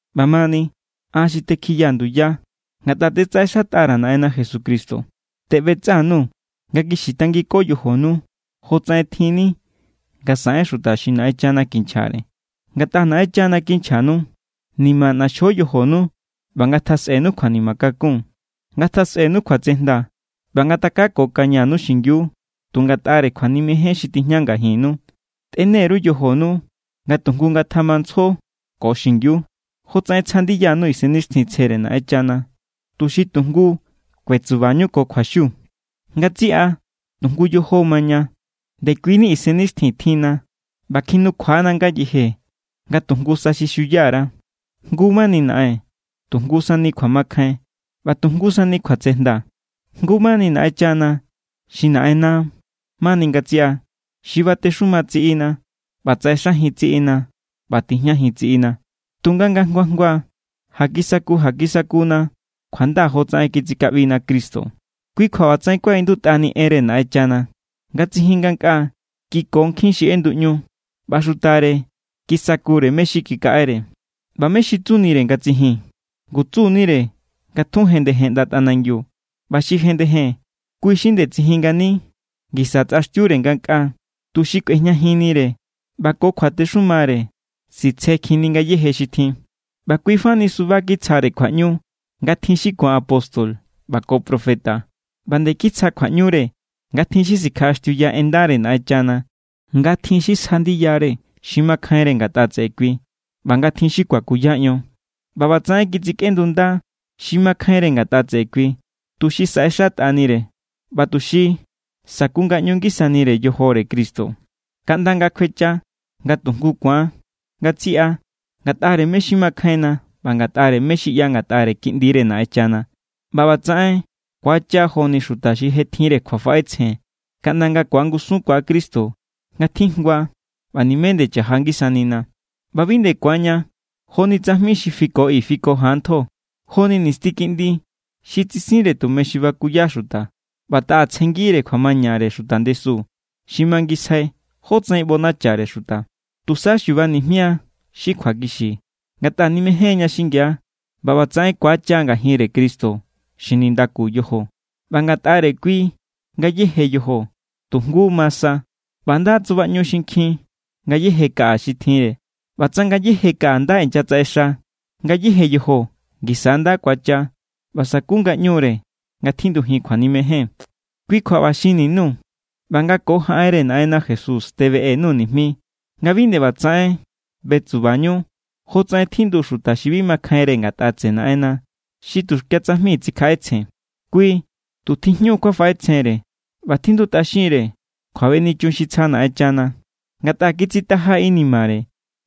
ꞌBamani, an xi tekjiyaa̱ nduya ngatꞌa tetsaꞌexatꞌa_ra̱ Naꞌenna Jesucristo teꞌbetsꞌa_nuu̱ nga kixi tangiko yojonu, jotsaꞌen tjinni nga saꞌen xuta xi Naꞌenchana kinchjare. Ngatꞌa Naꞌenchana kinchjanu. Nima ꞌnaxjo yojonu ꞌba ngatjasꞌenu kjuanima kakún. Ngatjasꞌenu kjuatsejnda ꞌba ngatakakokañanu xingiu tu ngatꞌare kjuanimejen xi tijña ngajinnu. Tꞌene_ru yojonu nga tu jngu ngatjamantsjo ko xingiu, jotsaꞌen tsja ndiyanu Isennixtjintsjere Naꞌenchana, tuxi tu jngu kuetsubañu ko kjuaxiu. Ngatsiꞌa tu jngu yojo= maña, ndekuini Isennixtjin tjinna, ꞌba kjinukjua=na ngayeje nga tu jngu sa xi xuya_ra. Jngu mani Naꞌen, tu jngu sani kjuamakjain, ꞌba tu jngu sani kjuasatenda. Jngu mani Naꞌenchana xi Naꞌenna mani ngatsiꞌa, xi batexuma tsiꞌina ꞌba tsaꞌexajin tsiꞌina ꞌba tijñajin tsiꞌina. Tunga nga jngua jngua ja kisaku ja kisaku=na kjuanda jotsaꞌen kitsikaꞌbina Cristo. Kui kjua ꞌbatsaꞌen kuaꞌindutꞌani enre Naꞌenchana: Nga tsijin ngankꞌaa, kiko nkjin xi ꞌenduꞌñu, ꞌba xutare kisakure mé= xi kikaꞌere. ꞌBa ¿mé= xi tsunire nga tsijin? Ngu tsunire nga tjun jendejen ꞌnda tꞌanangiu. ꞌBa xi jendejen, kui xi nde tsijin ngani ngisa tsꞌaxtiure ngankꞌaa, tuxi kꞌuejñajinnire ꞌba ko kjuatexumare sitsekjinkjinni ngayéje xi tjin. ꞌBa kuifa ni suba kitsjare kjuaꞌñu nga tjin xi ku̱an apóstol ꞌba ko profeta. ꞌBa nde kitsja kjuaꞌñure nga tjin xi sikjaꞌaxtiuya en ndare Naꞌenchana, nga tjin xi sja ndiyare xi makjainre ngatꞌa tseꞌe kui ꞌba nga tjin xi kuakuya ion. ꞌBa ꞌbatsaꞌen kitsikꞌendunda xi makjainre ngatꞌa tseꞌe kui, tuxi saꞌexatꞌanire ꞌba tuxi sakungaꞌñu ngisanire yojore Cristo, kaꞌnda nga kjuecha nga tu jngu ku̱an ngatsiꞌa ngatꞌare mé= xi makjainna ꞌba ngatꞌare mé= xi ꞌya ngatꞌare Kiꞌndire Naꞌenchana. ꞌBa ꞌbatsaꞌen ku̱acha joni xuta xi je tjinre kjuafaꞌetsjen kaꞌnda nga ku̱angusunkua Cristo nga tjijngua ꞌba nimé nde chaja ngisanina. ꞌBa bi nde ku̱anña joni tsajmi xi fiko i fiko jan ntjo, joni nisti kiꞌndi xi tsisinre tume xi bakuya xuta ꞌba taꞌa tsjenngire kjuamañare xuta ndesu xi mangisjai jótsaꞌen ꞌbonachare xuta. Tusa xuba nijmia xi kjuakixi ngatꞌa nimejénña xingia, ꞌba ꞌbatsaꞌen ku̱acha ngajinre Cristo xi nindaku yojo. ꞌBa ngatꞌare kui ngayéje yojo tu jngu ma sa, ꞌba nda tsubaꞌñu xinkjin ngayéje kaꞌa xi tjinre. ꞌBa tsa ngayéje kaꞌa nda inyatsaꞌexa, ngayéje yojo ngisa= nda ku̱acha ꞌba saku ngaꞌñure nga tjindujin kjuanimejen. Kui kjua ꞌba xinni_nuu̱ ꞌba nga ko jaꞌenre Naꞌenna Jesús tebeꞌe_nuu̱ nijmi nga bi nde ꞌbatsaꞌen betsubañu jotsaꞌen tjindu xuta xi bi makjainre ngatꞌa tseꞌe Naꞌenna, xi tuxkia tsajmi tsikjaꞌetsjen. Kui tu tijñu kjuafaꞌetsjenre ꞌba tjindutꞌaxinre kjuabenichun xi tsja Naꞌenchana, ngatꞌa kitsitaja= inimare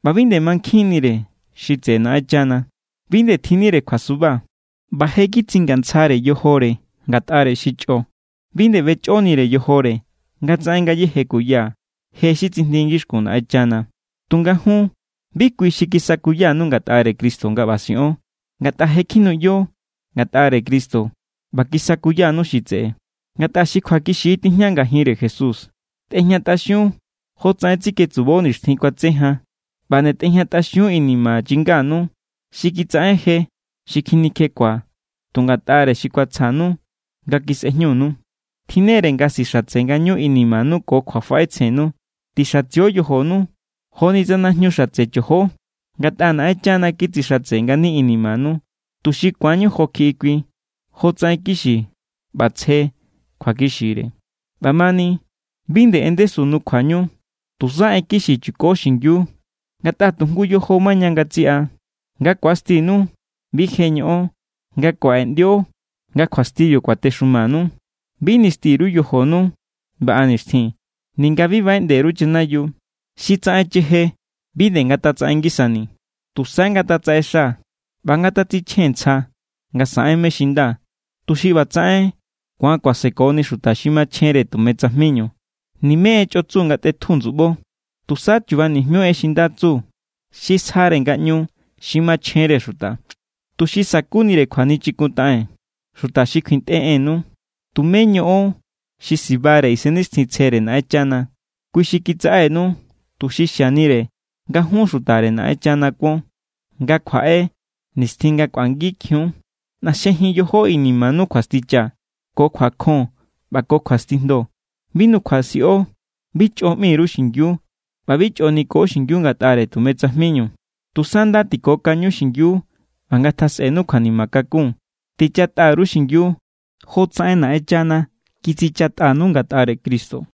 ꞌba bi nde mankjinnire xi tseꞌe Naꞌenchana. Bi nde tjinnire kjuasuba, ꞌba je= kitsingantsjare yojore ngatꞌare xi chꞌo. Bi nde ꞌbechꞌonire yojore nga tsaꞌen ngayéje kuya je xi tsijndi ngixkun Naꞌenchana. Tunga jun, bi kui xi kisakuyanu ngatꞌare Cristo, nga ꞌba siꞌon. Ngatꞌa je kjinuꞌyo ngatꞌare Cristo ꞌba kisakuyanu xi tseꞌe, ngatꞌa xi kjuakixi= tijña ngajinre Jesús. Tꞌejñatꞌaxiun jotsaꞌen tsiketsubo nixtjin kuatse jan. ꞌBa nde tꞌejñatꞌaxiun inima chinganu xi kitsaꞌen je xi kjinikjekjua tu ngatꞌare xi kuatsjanu nga kisꞌejñunu. Tjinnere nga sixatse ngañu inimanu ko kjuafaꞌetsjennu. Tixatsio yojonu joni tsa najñu xatse chojo. Ngatꞌa Naꞌenchana kitsixatse ngani inimanu, tuxi ku̱anñu jo kjiꞌi kui, jotsaꞌen kixi ꞌba tsje kjuakixire. ꞌBamani, bi nde en ndesu nukjuañu. Tusa en kixi chuko xingiu, ngatꞌa tu jngu yojo= maña ngatsiꞌa. Nga ku̱astinu, bi je ñoꞌon nga kuaꞌeꞌndio nga kjuastibiu kuatexumanu. Bi nisti_ru yojonu baꞌa nixtjin, ninga bi baꞌeꞌnde_ru chanayiu. Xi tsaꞌen cheje bi nde ngatatsaꞌen ngisani. Tusa ngatatsaꞌexa ꞌba ngatatsichjen ntsja nga saꞌen mé= xi nda, tuxi ꞌbatsaꞌen ku̱an kuasekoni xuta xi machjenre tume tsajminu. Nimé en chꞌo tsu ngatꞌetju ndsuꞌbo. Tusa chuba nijmiu en xi nda tsu xi sjare ngaꞌñu xi machjenre xuta, tuxi sa̱kunire kjuachikuntaꞌen xuta xi kjuintꞌe ennu. Tumé ñoꞌon xi sibare Isennixtjintsjere Naꞌenchana. Kui xi kitsaꞌenu tuxi xianire nga jun xutare Naꞌenchana kuon nga kjuaꞌe nixtjin nga kꞌuangikjiun. ꞌNaxjejin yojo inimanu kjuasticha, ko kjuakjon ꞌba ko kjuastijndo. Bi nukjuasiꞌo, bi chꞌo ꞌmi_ru xingiu, ꞌba bi chꞌo niko xingiu ngatꞌare tume tsajminu. Tusa nda tikokaño xingiu ꞌba ngatjasꞌenu kjuanima kakun. Tichatꞌa_ru xingiu jotsaꞌen Naꞌenchana kitsichatꞌanu ngatꞌare Cristo.